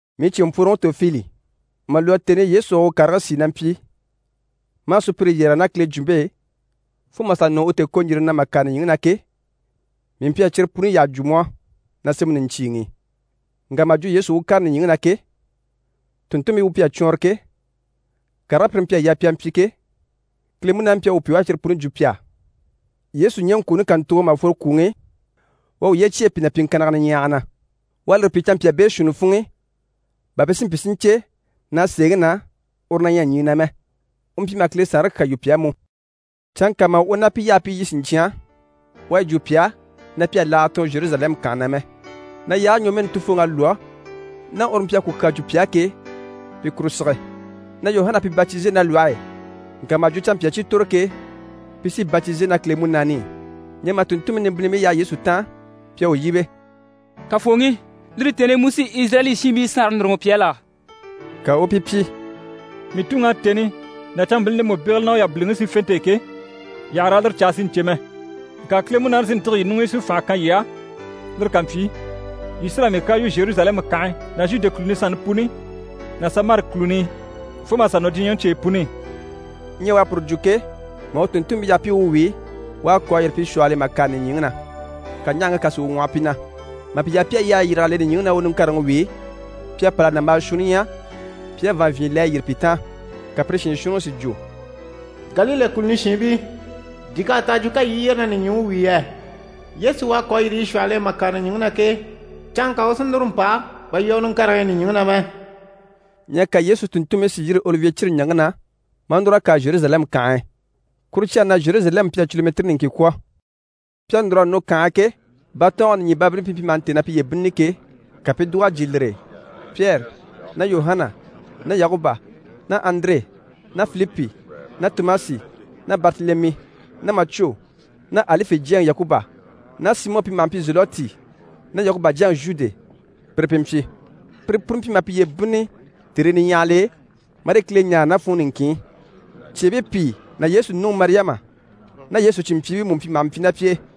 Mii cìnmpworoŋi Tofili, mà lwɔ́ tèni i Yesu à u karigii sìi na mpyi maa sùpyire yɛrɛge ná Kile jwumpe e, fo mà sà nɔ u tèekoɲjirini na mà kàre nìɲyiŋi na ke, mii mpyi a cyire puni yyaha jwo mu á na sémɛŋi niɲcyiiŋi i. Ŋka mà jwo Yesu u kàre nìɲyiŋi na ke, tùnntunmpii u mpyi a cwɔɔnrɔ ke, karigii pire mpyi a yaa pi a mpyi ke, Kile Munaani mpyi a u pyi u à cyire puni jwo pi á. Yesu ɲɛŋkwooni kàntugo mà fworo kwùŋi i, u à uye cyêe pi na pyiŋkannigii niɲyahagii na. U à lire pyi canmpyaa beeshuunni funŋ'i bà pi si mpyi si ɲcè na, sèeŋi na, uru na ɲyɛ ɲyii na mɛ. U mpyi maha Kile Saanre kyaa yu pi á mú. Canŋka mà u ná pi yaha pi i lyî siɲcyan, u à yi jwo pi á na pi àha laaga tɔɔn Zheruzalɛmu kànhe na mɛ, na yaage ɲwɔmɛɛni Tufooŋi à lwɔ́, ná uru mpyi a ku kyaa jwo pi á ke, pi kuru sige, na Yuhana à pi batize ná lwɔhe e, ŋka mà jwo canmpyaa cyi tòro ke, pi sí batize ná Kile Munaani i. Ɲyɛ mà tùnntunmpii nimbinnibii yaha Yesu taan, pi à u yíbe: «Kafooŋi, lire tèni i mu sí Izirayɛli shiinbii saanre núruŋɔ pi á la?» Ka u u pi pyi: «Mii Tuŋi à tèni ná canmbilini ndemu bégele ná u yabiliŋi sífente e ke, yii àha raa lire caa si ɲcè mɛ. Ŋka Kile Munaani sí n‑tîge yii ɲuŋ'i si fànha kan yii á, lire ká mpyi, yii sí raa mii kyaa yu Zheruzalɛmu kànhe ná Zhude kùluni sanni puni ná Samari kùluni i, fo mà sà nɔ diɲyɛŋi cyeyi puni i.» Ɲyɛ u à puru jwo ke, mà u tùnntunmpii yaha pi i u wíi, u à kò a yîri pi shwɔhɔl'e mà kàre nìɲyiŋi na, ka ɲahaŋke kà si u ŋwɔhɔ pi na. Mà pi yaha pi à yyahayi yîrig'a le nìɲyiŋi i, na u niŋkareŋi wíi, pi à pâl'a nàmbaa shuunni ɲya pi à vàanvyinɲyɛ le a yyére pi taan. Ka pire shiin shuunniŋi si jwo: «Galile kùluni shiinbii, di k'à ta a jwo ka yii i yyére na nìɲyiŋi wíi yɛ? Yesu u à kò a yîri yii shwɔhɔl'e mà kàre nìɲyiŋi na ke, canŋka u sí núru n‑pa bà yii à u niŋkareŋi ɲya nìɲyiŋi na mɛ.» Ɲyɛ ka Yesu tùnntunmpii si yîri Olivye cire ɲaŋke na, maa núr'a kàre Zheruzalɛmu kànhe e. Kuru cyage ná Zheruzalɛmu mpyi a culumɛtiri niŋkin kwɔ̀. Pi à núr'a nɔ kànhe e ke, batɔɔnge nìɲyibabilini i pi mpyi maha ntêe na piye bínnini ke, ka pi i dùg'a jyè lire e. Pyɛri ná Yuhana ná Yakuba ná Andire ná Filipi ná Tomasi ná Baritelemi ná Macwo ná Alife jyaŋi Yakuba ná Simɔ pi maha mpyi Zelɔti, ná Yakuba jyaŋi Zhude, pire pi mpyi. Pire puni mpyi maha piye bínnini tèrii niɲyahagil'e, marii Kile ɲáare ná funŋɔ niŋkin i. Cyeebii pìi ná Yesu nuŋi Mariyama ná Yesu cìnmpyiibii mú mpyi maha mpyi ná pi e.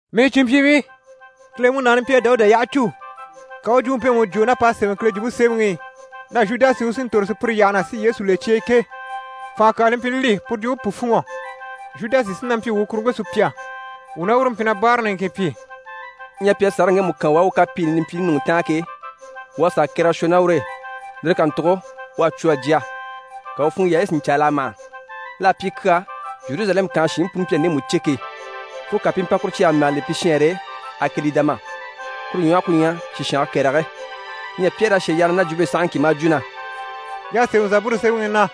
«Mii cìnmpyiibii, Kile Munaani mpyi a Dawuda yyaha cû, ka u u jwumpe mpemu jwo ná p'à sémɛ Kile Jwumpe Semɛŋi i, na Zhudasi u sí n‑tòro sùpyire yyaha na, si Yesu le cye e ke, fànha kyaa li mpyi li li, puru jwumpe pu fûnŋɔ. Zhudasi sí na mpyi wuu kuruŋke sùpya, wuu ná uru mpyi na báara niŋkin pyi.» (Ɲyɛ pi à sàraŋi ŋgemu kan u á u kapiini nimpyiini ɲùŋɔ taan ke, u à sà kɛrɛgɛ shwɔ ná ur'e. Lire kàntugo u à cwo a jya, ka u funŋɔ yaayi si ɲcɛɛg'a mâha. L'à pyi kyaa Zheruzalɛmu kànhe shiinbii puni mpyi a ndemu cè ke, fo ka pi i mpa kuru cyage mɛge le pi shɛɛnre e: «Akɛlidama» kuru ɲwɔhɔ ku ɲyɛ: «Sishange Kɛrɛge».) Ɲyɛ Pyɛri à shà yyaha na ná jwumpe e sahaŋki maa jwo na: «Y'à sémɛ Zaburu sémɛŋi i na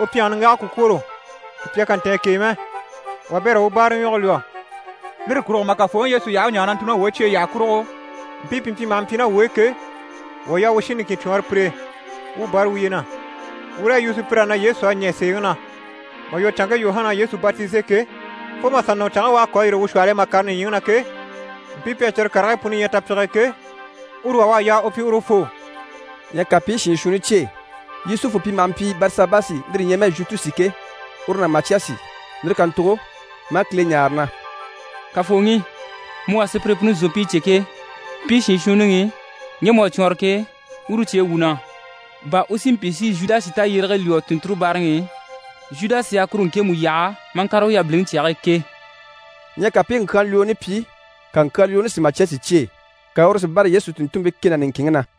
“U pyɛnge niŋgage ku kwôro, Sùpya kà ntɛ̀ɛn k'e mɛ.” “Wabɛrɛ u u báaraɲwɔge lwɔ́.” Lire kurugo mà Kafooŋi Yesu yaha u u ɲaare na ntùuli ná wuu e cyeyi yyaha kurugo, mpii pi mpyi maha mpyi ná wuu e ke, wuu à yaa wuu shin niŋkin cwɔɔnrɔ pire e, wuu bâra wuye na, wuu raa yi yu sùpyir'á na Yesu à ɲɛ̀ sèeŋi na. Mà lwɔ́ canŋke Yuhana à Yesu batize ke, fo mà sà nɔ canŋke u à kò a yîri wuu shwɔhɔl'e mà kàre nìɲyiŋi na ke, mpii pi à cyire karigii puni ɲya tapyige e ke, uru wà u à yaa u pyi urufoo.» Ɲyɛ ka pi i shiin shuunni cyêe, Yusufu pi maha mpyi Barisabasi, lire ɲyɛ mɛ Zhutusi ke, uru ná Macyasi. Lire kàntugo maa Kile ɲáare na: «Kafooŋi, mu u à sùpyire puni zòompii cè ke, mpii shiin shuunniŋi i, ŋge mu à cwɔɔnrɔ ke, uru cyêe wuu na, bà u si mpyi si Zhudasi tayyérege lwɔ́ tùnnture báaraŋi i, Zhudasi à kuru ŋkemu yaha maa ŋkàre u yabiliŋi cyage e ke.» Ɲyɛ ka pi i ŋkyaanlwooni pyi, ka ŋkyaanlwooni si Macyasi cyêe, ka uru si bâra Yesu tùnntunmpii kɛ ná niŋkinŋi na.